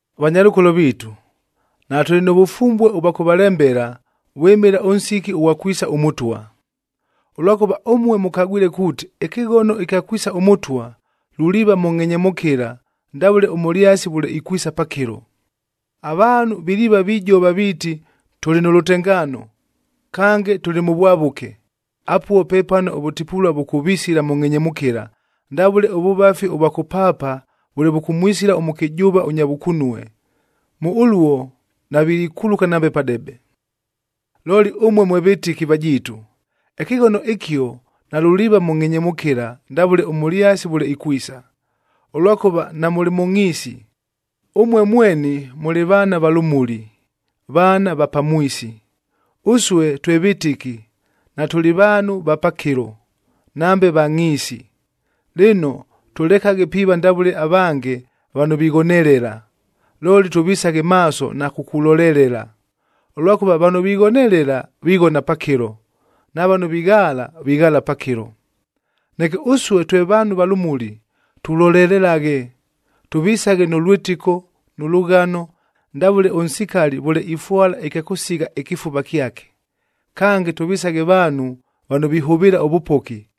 Vanyalʉkolo viitu, natʉlɨ nʉ vʉfumbue ʉvwa kʉvalembela, vwɨmɨla ʉnsiki ʉghwa kwisa ʉMʉtwa. Ʉlwakʉva ʉmue mʉkagwile kuuti ɨkɨghono ɨkya kwisa ʉMʉtwa, luliiva mʉ ngʼhenyemʉkɨla ndavʉle ʉmʉlyasi vʉle ikwisa pakɨlo. Avaanhu viliiva vijova viiti, “Tʉlɨ nʉ lʉtengaano, kange tʉlɨ mʉ vwavʉke,” apuo pepano ʉvʉtipulua vʉkʉvisila mʉ ngʼhenyemʉkɨla, ndavʉle ʉvʉvafi ʉvwa kʉpaapa vʉle vʉkʉmwisila ʉmʉkɨjʉʉva ʉnya vʉkunue. Mʉ ʉluo navilikuluka nambe padebe. Looli ʉmue mwe vɨtɨki vajiitu, ɨkɨghono ɨkio nalʉliiva mʉ ngʼhenyemʉkɨla ndavʉle ʉmʉlyasi vʉle ikwisa, ʉlwakʉva namʉlɨ mʉ ngʼhiisi. Ʉmue mweni mʉlɨ vaana va lʉmuli, vaana va pamwisi. Ʉsue twe vɨtɨki, natʉlɨ vaanhu va pakɨlo, nambe va ngʼhiisi. Lɨno, tʉlekaghe piiva ndavʉle avange vano vighonelela, looli tʉvisaghe maaso na kukulolelela. Ʉlwakʉva vano vighonelela, vighona pakɨlo. Na vano vighaala, vighaala pakɨlo. Neke ʉsue twe vaanhu va lʉmuli, tulolelelaghe. Tʉvisaghe nʉ lwɨtɨko, nʉ lʉghano, ndavʉle ʉnsikali vʉle ifwala ɨkya kʉsigha ɨkɨfuva kyake. Kange, tʉvisaghe vaanhu vano vihʉvɨɨla ʉvʉpoki,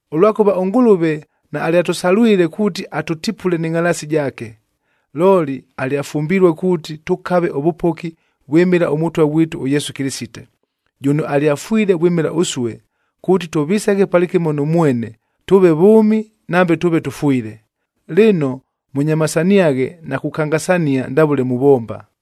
Ʉlwakʉva ʉNgʉlʉve naalyatʉsalwile, kuuti atʉtipule nɨ ngʼhalaasi jaake, looli alyafumbilue kuuti tʉkave ʉvʉpoki vwɨmɨla ʉMʉtwa ghwitu ʉYesu Kɨlɨsite, jʉno alyafwile vwɨmɨla ʉsue, kuuti tʉvisaghe palɨkɨmo nʉ mwene, tʉʉve vʉʉmi nambe tʉʉve tʉfwile. Lɨno, mʉnyamasaniaghe na kukangasania ndavʉle muvomba.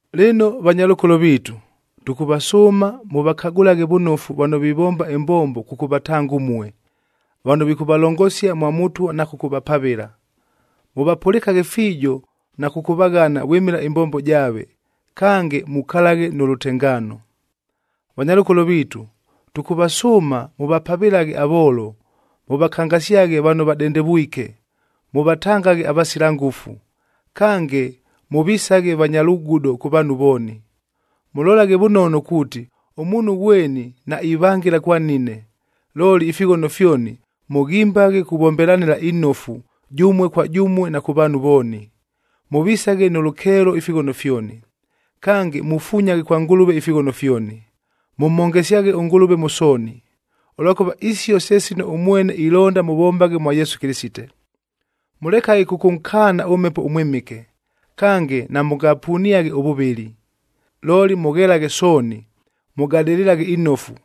Lɨno vanyalʉkolo viitu, tʉkʉvasʉʉma mʉvakagʉlaghe vʉnofu vano vivomba ɨmbombo kʉkʉvatanga ʉmue, vano vikʉvalongosia mwa Mʉtwa na kʉkʉvapavɨla. Mʉvapʉlɨkaghe fiijo na kʉkʉvaghana vwɨmɨla ɨmbombo jaave. Kange, mukalaghe nʉ lʉtengaano. Vanyalʉkolo viitu, tʉkʉvasʉʉma mʉvapavɨlaghe avoolo, mʉvakangasyaghe vano vadendevwike, mʉvatangaghe avasila ngʉfu. Kange, mʉvisaghe vanya lugudo kʉ vaanhu vooni. Mʉlolaghe vʉnono kuuti, ʉmuunhu ghweni naivangɨla kwa nnine. Looli ifighono fyoni mʉghimbaghe kʉvombelanɨla inofu jʉmue kwa jʉmue na kʉ vaanhu vooni. Mʉvisaghe nʉ lʉkeelo ifighono fyoni. Kange, mufunyaghe kwa Ngʉlʉve ifighono fyoni, mʉmhongesyaghe ʉNgʉlʉve mʉ sooni, ʉlwakʉva isio se sino ʉmwene ilonda mʉvombaghe mwa Yesu Kɨlɨsite. Mʉlekaghe kʉkʉnkaana ʉMhepo ʉMwɨmɨke. Kange, namʉngapuniaghe ʉvʉvɨli, looli mʉghelaghe sooni. Mʉgadɨlɨlaghe inofu,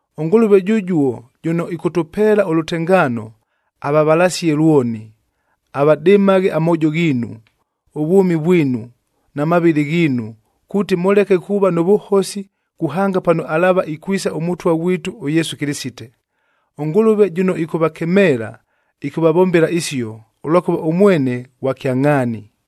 ɄNgʉlʉve jʉjuo jʉno ɨkʉtʉpeela ʉlʉtengaano, avavalasie lwoni. Avadɨmaghe amoojo ghiinu, ʉvwʉmi vwinu, na mavɨlɨ ghiinu, kuuti mʉleke kuuva nʉ vʉhosi, kuhanga pano alaava ikwisa ʉMʉtwa ghwitu ʉYesu Kɨlɨsite. ɄNgʉlʉve jʉno ɨkʉvakemeela, ɨkʉvavombela isio, ʉlwakʉva ʉmwene ghwa kyangʼhaani.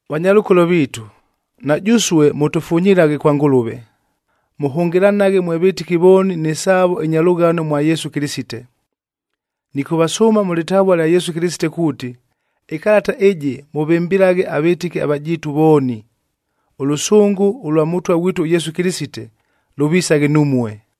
Vanyalʉkolo viitu, na jʉsue mʉtʉfunyilaghe kwa Ngʉlʉve. Mʉhʉngɨlanaghe mwe vɨtɨki vooni nɨ saavo ɨnya lʉghano mwa Yesu Kɨlɨsite. Nɨkʉvasʉʉma mʉ lɨtavua lya Yesu Kɨlɨsite kuuti, ɨkalata ɨjɨ mʉvɨmbɨlaghe avɨtɨki avajiitu vooni. Ʉlʉsʉngʉ ʉlwa Mʉtwa ghwitu ʉYesu Kɨlɨsite, lʉvisaghe numue.